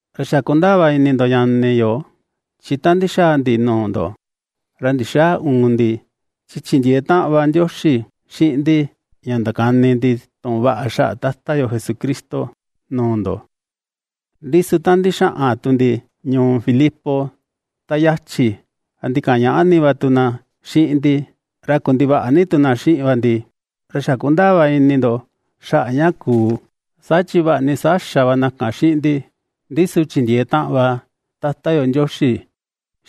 Ra xa kundaa va ini ndo ñani yo, chi ta ndixaa ndi nuu ndo, ra ndixäa uun ndi, chi chindiee taꞌan va Ndioxi xiꞌin ndi ña ndakani ndi tuꞌun vaꞌa xaꞌa Tata yo Jesucristo nuu ndo. Ndi su ta ndixaꞌan tu ndi ñuu Filipos ta yachi, ra ndikañaꞌa ni va tu na xiꞌin ndi, ra kundivaꞌa ni tu na xiꞌin va ndi, ra xa kundaa vaꞌa ini ndo xaꞌa ña kuu, saa chi vaꞌa ni saa xa va na kan xiꞌin ndi, ndi su chindiee taꞌan va Tata yo Ndioxi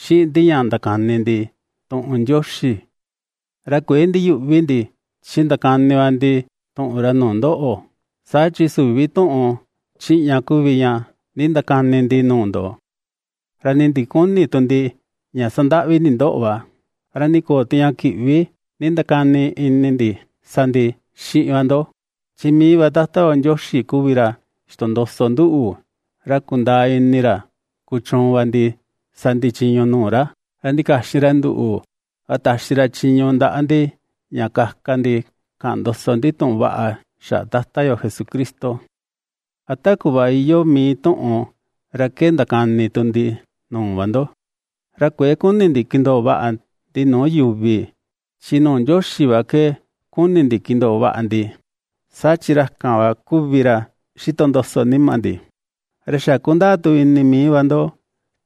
xiꞌin ndi ña ndakani ndi tuꞌun Ndioxi, ra kuëe ndiyüꞌvi ndi, chi ndakani va ndi tuꞌun ra nuu ndoꞌo. Saa chi süvi tuꞌun chiꞌña kuvi ña nindakani ndi nuu ndo, ra nii ndiküni tu ndi ña sandaꞌvi ndi ndoꞌo va, ra nii köo tu ña kiꞌvi nindakani ini ndi, sa ndi xiꞌin va ndo. Chi mii va Tata yo Ndioxi kuvi ra xitondoso nduꞌu, ra kundaa ini ra kuchuun va ndi sa ndi chiñu nuu ra, ra ndikaxin ra nduꞌu, ra taxi ra chiñu ndaꞌa ndi ña kaka ndi kaꞌan ndoso ndi tuꞌun vaꞌa xaꞌa Tata yo Jesucristo, ra ta kuꞌva iyoo mii tuꞌun ra ke ndakani ndi nuu va ndo. Ra kuëe kuni ndi kindoo vaꞌa ndi nuu yuvi, chi nuu Ndioxi va ke ^kuni ndi kindoo vaꞌa ndi, saa chi ra kan va kuvi ra ^xitondoso nima ndi. Ra xa kundaa tu ini mii va ndo,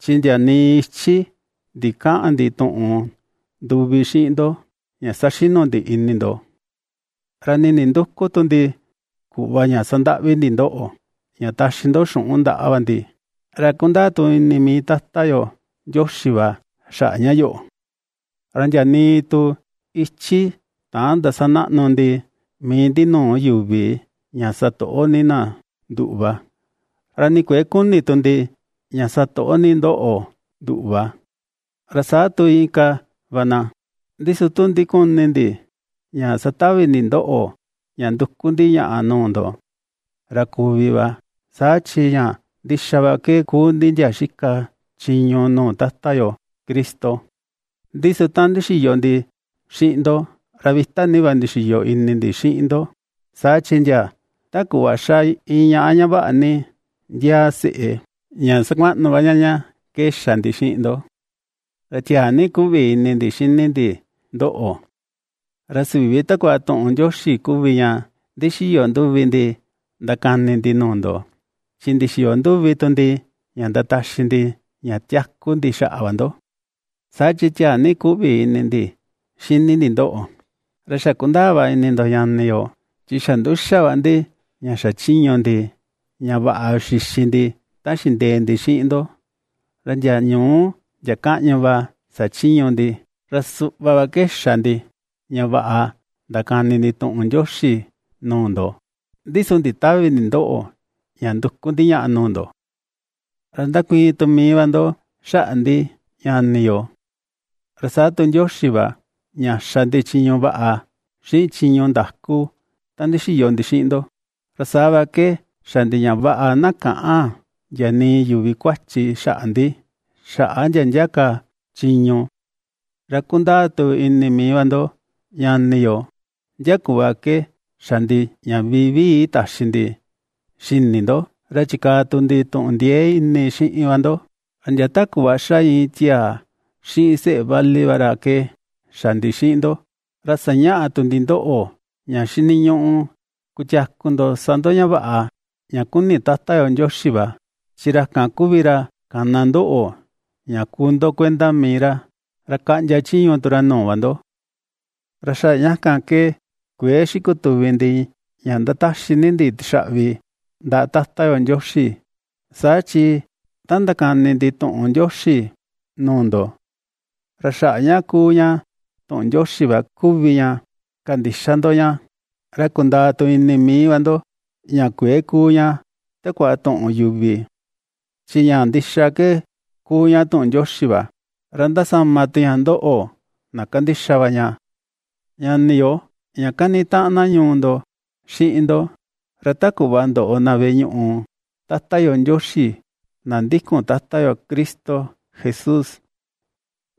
chi ndia nii ichi ndikäꞌan ndi tuꞌun nduvi xiꞌin ndo ña saxinu ndi ini ndo, ra nii nindüku tu ndi kuꞌva ña sandaꞌvi ndi ndoꞌo, ña taxi ndo xuꞌun ndaꞌa va ndi. Ra kundaa tu ini mii Tata yo Ndioxi va xaꞌa ña yoꞌo. Ra ndia nii tu ichí täan ndasanaꞌnu ndi mii ndi nuu yu̱vi ña ná satoꞌo ni na nduꞌu va, ra nii kuëe kuni tu ndi ña satoꞌo ni ndoꞌo nduꞌu va, ra saa tu inka va na. Ndi su tu ndikuni ndi ña satavi ndi ndoꞌo ña nduku ndi ñaꞌa nuu ndo, ra kuvi va, saa chi ña ndixa va ke kuu ndi ndia xika chiñu nuu Tata yo Cristo. Ndi su ta ndixiyo ndi xiꞌin ndo, ra vita ni va ndixiyo ini ndi xiꞌin ndo, saa chi ndia ta kuꞌva ^xa iin ñaꞌa, ña vaꞌa ni ndiaa seꞌe, ña sakuaꞌnu va ña ña ke xa ndi xiꞌin ndo. Ra tiaa ni ^kuꞌvi ini ndi xini ndi ndoꞌo, ra süvi takua tuꞌun Ndioxi kuvi ña ndixiyo nduvi ndi ndakani ndi nuu ndo, chi ndixiyo nduvi tu ndi ña ndataxi ndi ña tiaku ndi xaꞌa va ndo, saa chi tiaa ni kuꞌvi ini ndi xini ndi ndoꞌo. Ra xa ^kundaa va ini ndo ñani yo, chi xa nduxa va ndi ña xachiñu ndi, ña vaꞌa xixi ndi ta xindee ndi xiꞌin ndo, ra ndia ñuú, ndia kaꞌñu va xachiñu ndi, ra suꞌva va ke xa ndi ña vaꞌa ndakani ndi tuꞌun Ndioxi nuu ndo, ndi su nditävi ndi ndoꞌo ña nduku ndi ñaꞌa nuu ndo. Ra ^ndakuiin tu mii va ndo xaꞌa ndi ñani yo, ra saa tu Ndioxi va, ña xa ndi chiñu vaꞌa, xiꞌin chiñu ndaku ta ndixiyo ndi xiꞌin ndo, ra saa va ke xa ndi ña vaꞌa na käꞌan ndia nii yuvi kuachi xaꞌa ndi, xaꞌa ndia ndia ka chiñu. Ra kundaa tu ini mii va ndo ñani yo, ndia kuꞌva ke xa ndi ña vivii taxi ndi xini ndo, ra chikaa tu ndi tuꞌun ndiee ini xiꞌin va ndo, ra ndia ta kuꞌva ^xa iin tiaa xiꞌin seꞌe vali va ra ke xa ndi xiꞌin ndo. Ra sañaꞌa tu ndi ndoꞌo, ña xiniñuꞌu, kutiaku ndo sa ndo ña vaꞌa ña kuni Tata yo Ndioxi va, chi ra kan kuvi ra kana ndoꞌo ña kuu ndo kuenda mii ra, ra kaꞌndia chiñu tu ra nuu va ndo. Ra xaꞌa ña kan ke kuëe xikutuvi ndi ña ^ndataxi ni ndi tixaꞌvi ndaꞌa Tata yo Ndioxi, saa chi ta ndakani ndi tuꞌun Ndioxi nuu ndo, ra xaꞌa ña ^kuu ña tuꞌun Ndioxi va kuvi ña kandixa ndo ña, ra kundaa tu ini mii va ndo ña kuëe kuu ña takua tuꞌun yuvi. Chi ña ndixa ke kuu ña tuꞌun Ndioxi va, ra ^ndasama tu ña ndoꞌo, na kandixa va ña. Ñani yo, ña kanitaꞌan na ñuu ndo xiꞌin ndo, ra ta kuꞌva ndoꞌo na veꞌe ñuꞌu Tata yo Ndioxi na ndikun Tata yo Cristo Jesús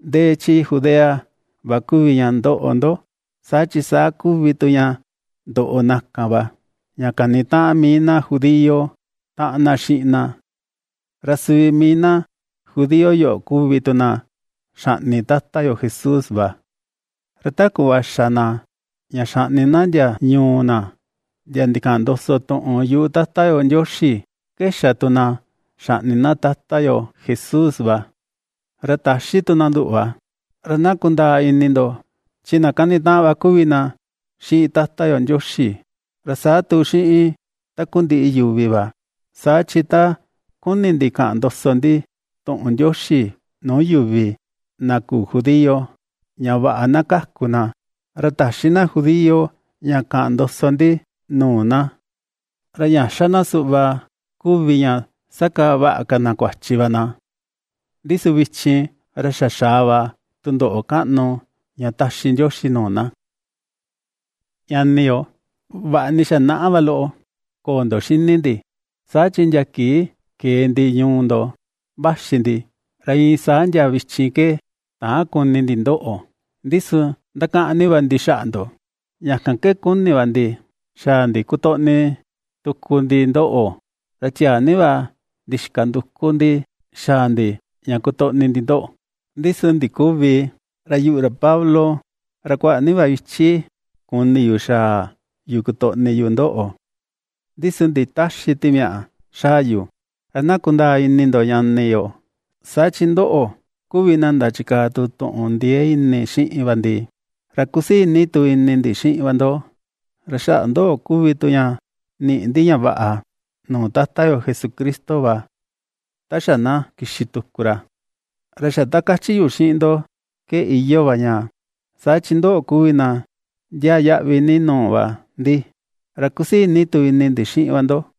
ndee chi Judea va kuvi ña ndoꞌo ndo, saa chi saa kuvi tu ña ndoꞌo na kan va, ña kanitaꞌan mii na judío taꞌan na xiꞌin na. Ra suvi mii na judío yoꞌo kuvi tu na xaꞌni Tata yo Jesús va. Ra ta kuꞌva xa na ña xaꞌni na ndia ñuu na ndia ndikaꞌan ndoso tuꞌun yuꞌu Tata yo Ndioxi, ke xa tu na ña xaꞌni na Tata yo Jesús va. Ra ta̱xí tu na nduꞌu va. Ra na kundaa ini ndo, chi na kanitaꞌan va kuvi na xiꞌin Tata yo Ndioxi, ra saa tu xiꞌin takundiꞌi yuvi va. Saa chi ta ^kuni ndi kaꞌan ndoso ndi tuꞌun Ndioxi nuu yuvi na küu judío ña vaꞌa na kaku na, ra täxi na judío ña kaꞌan ndoso ndi nuu na. Ra ña ^xa na suꞌva kuvi ña ^sakaa vaꞌa ka na kuachi va na. Ndi su vichin, ra xa xaa va tundoꞌo kaꞌnu ña ^taxi Ndioxi nuu na. Ñani yo, vaꞌa ni xa naꞌa va loꞌo köo ndo xini ndi, saa chi ndia kii kee ndi ñuu ndo vaxi ndi, ra iin saa ndia vichin ke täan kuni ndi ndoꞌo, ndi su ndakaꞌan ni va ndi xaꞌa ndo, ña kan ke kuni ni va ndi xaa ndi kotoꞌni tuku ndi ndoꞌo. Ra tiaa ni va ndixika nduku ndi xaa ndi ña kotoꞌni ndi ndoꞌo, ndi su ndiküvi, ra yuꞌu ra Pablo, ra kuaꞌa ni ka va ichi kuni yu ña xaa yu kotoꞌni yu ndoꞌo, ndi su nditäxi Timiaꞌa xaa yu. Ra na kundaa ini ndo ñani yo, saa chi ndoꞌo kuvi na ndachikaa tu tuꞌun ndiee ini xiꞌin va ndi, ra kusii ni tu ini ndi xiꞌin va ndo, ra xaꞌa ndoꞌo kuvi tu ña niꞌi ndi ña vaꞌa nuu Tata yo Jesucristo va, ta xa na kixi tuku ra. Ra xa ta ^kachi yu xiꞌin ndo ke iyoo va ña, saa chi ndoꞌo kuvi na ndiaa yaꞌvi ni nuu va ndi, ra kusii ni tu ini ndi xiꞌin va ndo.